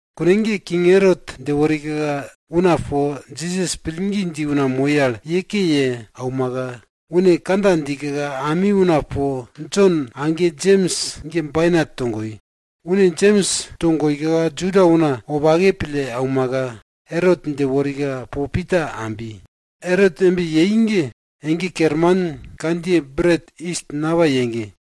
Kune ge king Erot dje worika una po Jisas pillgi dji una moi al ye ke ye aumaka, une kandja djika ami una po Jon age Jems ge bainat togoi. Une Jems togoika Juda una wopake pille aumaka, Erot dje worika po Pita ambi. Erot embe yei ge, ege kerman kandjiye Bret yis napai ege.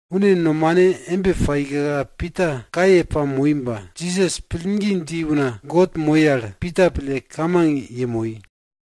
Une nomane embe paika Pita kaye pamoi ba, Jisas pillgi dji una God moi al Pita pille kamang yemoi.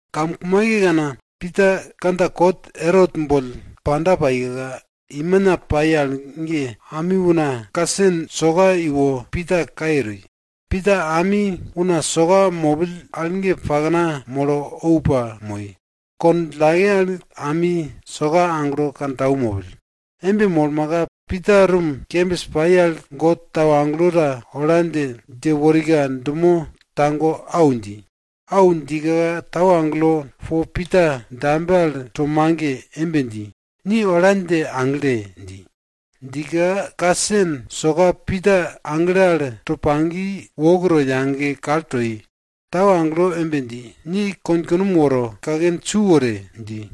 Kamkumaikekana, Pita kandja kot Erot boll panda paika, imina pai al ge ami una kasen soka iwo Pita kaye toi. Pita ami una soka mopill al pakna molo ou pamoi. Kond djillake al ami soka aglo kantau mopill. Embe molmaka Pita rum kembis pai al God tau agelo ta ola dje, dje worika dumo tago au dji. Au djika tau agelo po Pita dambe al to mage embe dji, ni ola dje agle! dji. Djika kasen soka Pita agle al to pagi wok to yage kal toi, tau agelo embe dji, ni konkunom woro, kaken su wore! dji.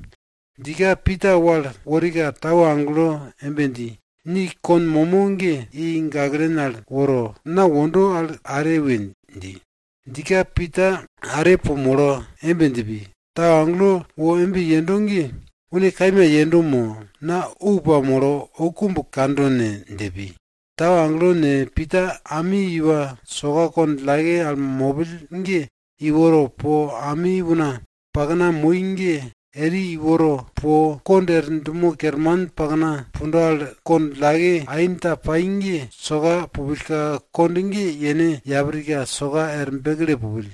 Djika Pita wal worika, tau agelo embe dji, ni kon momo ge i gaklen al woro, na wondo al are we! dji. Djika Pita are po molo embe dje pi, tau agelo wo embe yendo ge une kaima yendo mo, mo na ou pamolo oukumb kando ne? dje pi. Tau agelo ne, Pita ami iwa soka kond djillake al mopill ge iworo po, ami una pakna moi ge eri iworo, po kond er dumo kerman pakna pundo al kond djillake ain ta pai ge, soka pupillka kond ge yene yaprika soka er bekle pupill.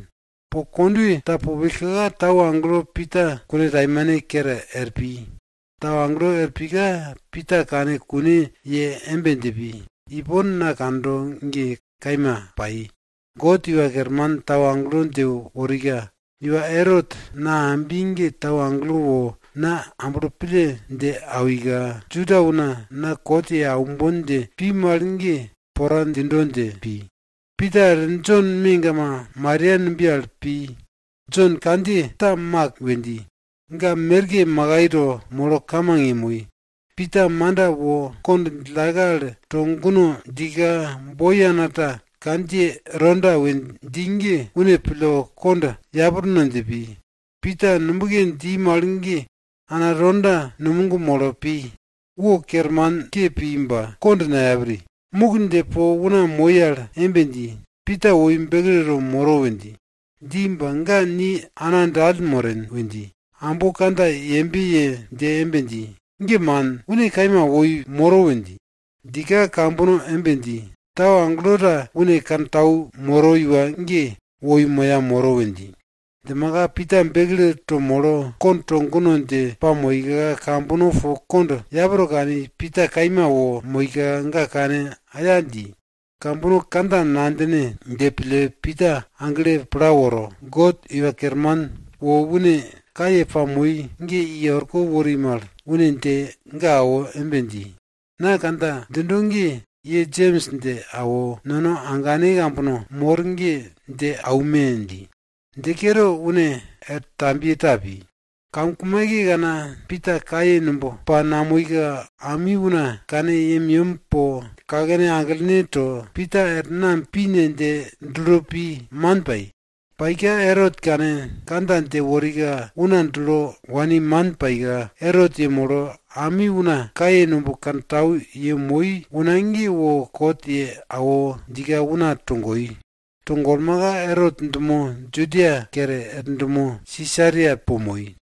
Po kondwe ta pupillka, tau agelo Pita kuntaimane kere er pi. Tau agelo er pika, Pita kane kune ye embe dje pi, ipon na kando ge kaima pai. God Iwa Kerman tau agelo dje worika, iwa Erot na ambi ge tau agelo wo na amblo pille dje awika, Juda una na kot ye aumbon dje pi mal ge pora djindo dje pi. Pita er Jon megama Maria numbiye al pi. Jon kandjiye ta Mak we dji. Ga merke makai to molo kamang yemoi. Pita manda wo kond djillake al to guno djika, boi ana ta kandjiye Roda we dji ge une pille kond yaprno dje pi. Pita nubke dji mal ge ana Roda numog molo pi, wo kermanke pi ba kond nayapri, muk dje po una moi al embe dji, Pita woi bekleto moro we dji. Dji ba ga ni ana dall moren we dji, ambo kandja yembe ye dje embe dji, ge man! Une kaima woi moro we dji. Djika kambono embe dji, tau agelo ta une kantau moro iwa ge woi moya moro we dji. Djimaka Pita bekleto molo kond to guno dje pamoika, kambono po kond yapro kani, Pita kaima wo moika ga kane aya dji. Kambono kandja nadjine dje pille Pita agle pla woro, God Iwa Kerman wo une kaye pai ge i orko wori mal, une dje ga awo embe dji, na kandja djindo ge ye Jems dje awo, nono agane ambane kambono mor ge dje aume! dji. Dje kere, une er tambiye ta pi. Kamkumaikekana Pita kaye numb pa namoika, ami una kane yemyem po, kakene aglene to, Pita er nam pi ne? dje dulo pi, man pai. Paika Erot kane kandja dje worika una dulo wani man paika, Erot yemolo ami una kaye numb kantau yemoi una ge wo kot ye awo djika una togoi. To golmaka Erot dumo Judia kere er dumo Sisaria po moi.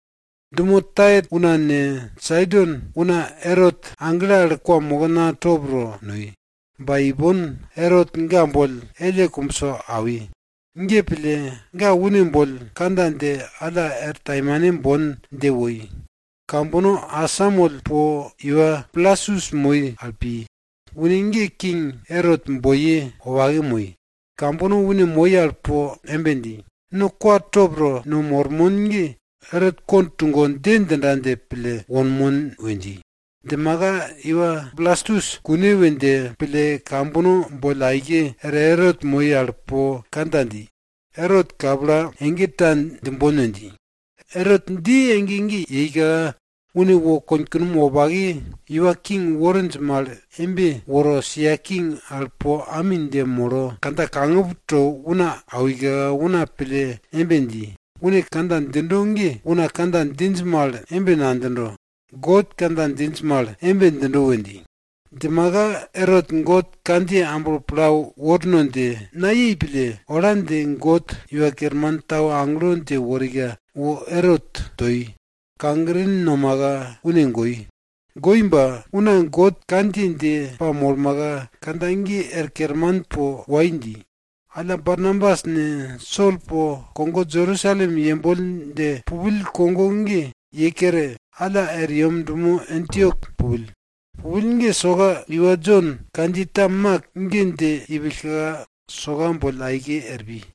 Dumo Tair una ne, Saidon una Erot agle al kwamokna top to noi. Ba ipon Erot ga boll elle kumbso awi. Ge pille ga une boll kandja dje alla er taimane bon dje woi. Kambono asamoll po iwa Blastus moi al pi. Une ge King Erot boiye wopake moi. Kambono une moi al po embe dji, no kwa top to no mormon ge Erot kond tugo dje djinda dje pille wonmon we dji. Djimaka iwa Blastus kune we dje pille, kambono boll aike er Erot moi al po kandja dji. Erot, kapla, ege ta djimbon we dji. Erot dji ege ge yeika, une wo konkunom wopake iwa king worinj mal embe woro, sia king al po ami dje molo, kandja kangup to una awika, una pille embe dji, une kandja djindo ge una kandja djinj mal embe nadjindo, god kandja djinj mal embe djindo we dji. Djimaka Erot God kandjiye amblo pla worno dje nayei pille, ola dje God Iwa Kerman tau agelo ta dje worika wo Erot toi, kagrin nomaka une goi. Goi ba, una God kandjiye dje pamolmaka, kandja ge er kerman po wai dji. Alla Barnabas ne, Sol po kogo Jerusalem yemboll dje pupill kogo ge ye kere, alla er yem dumo Antiok pupill. Pupill ge soka iwa Jon kandjiye ta Mak ge dje ipillka, soka boll aike er pi.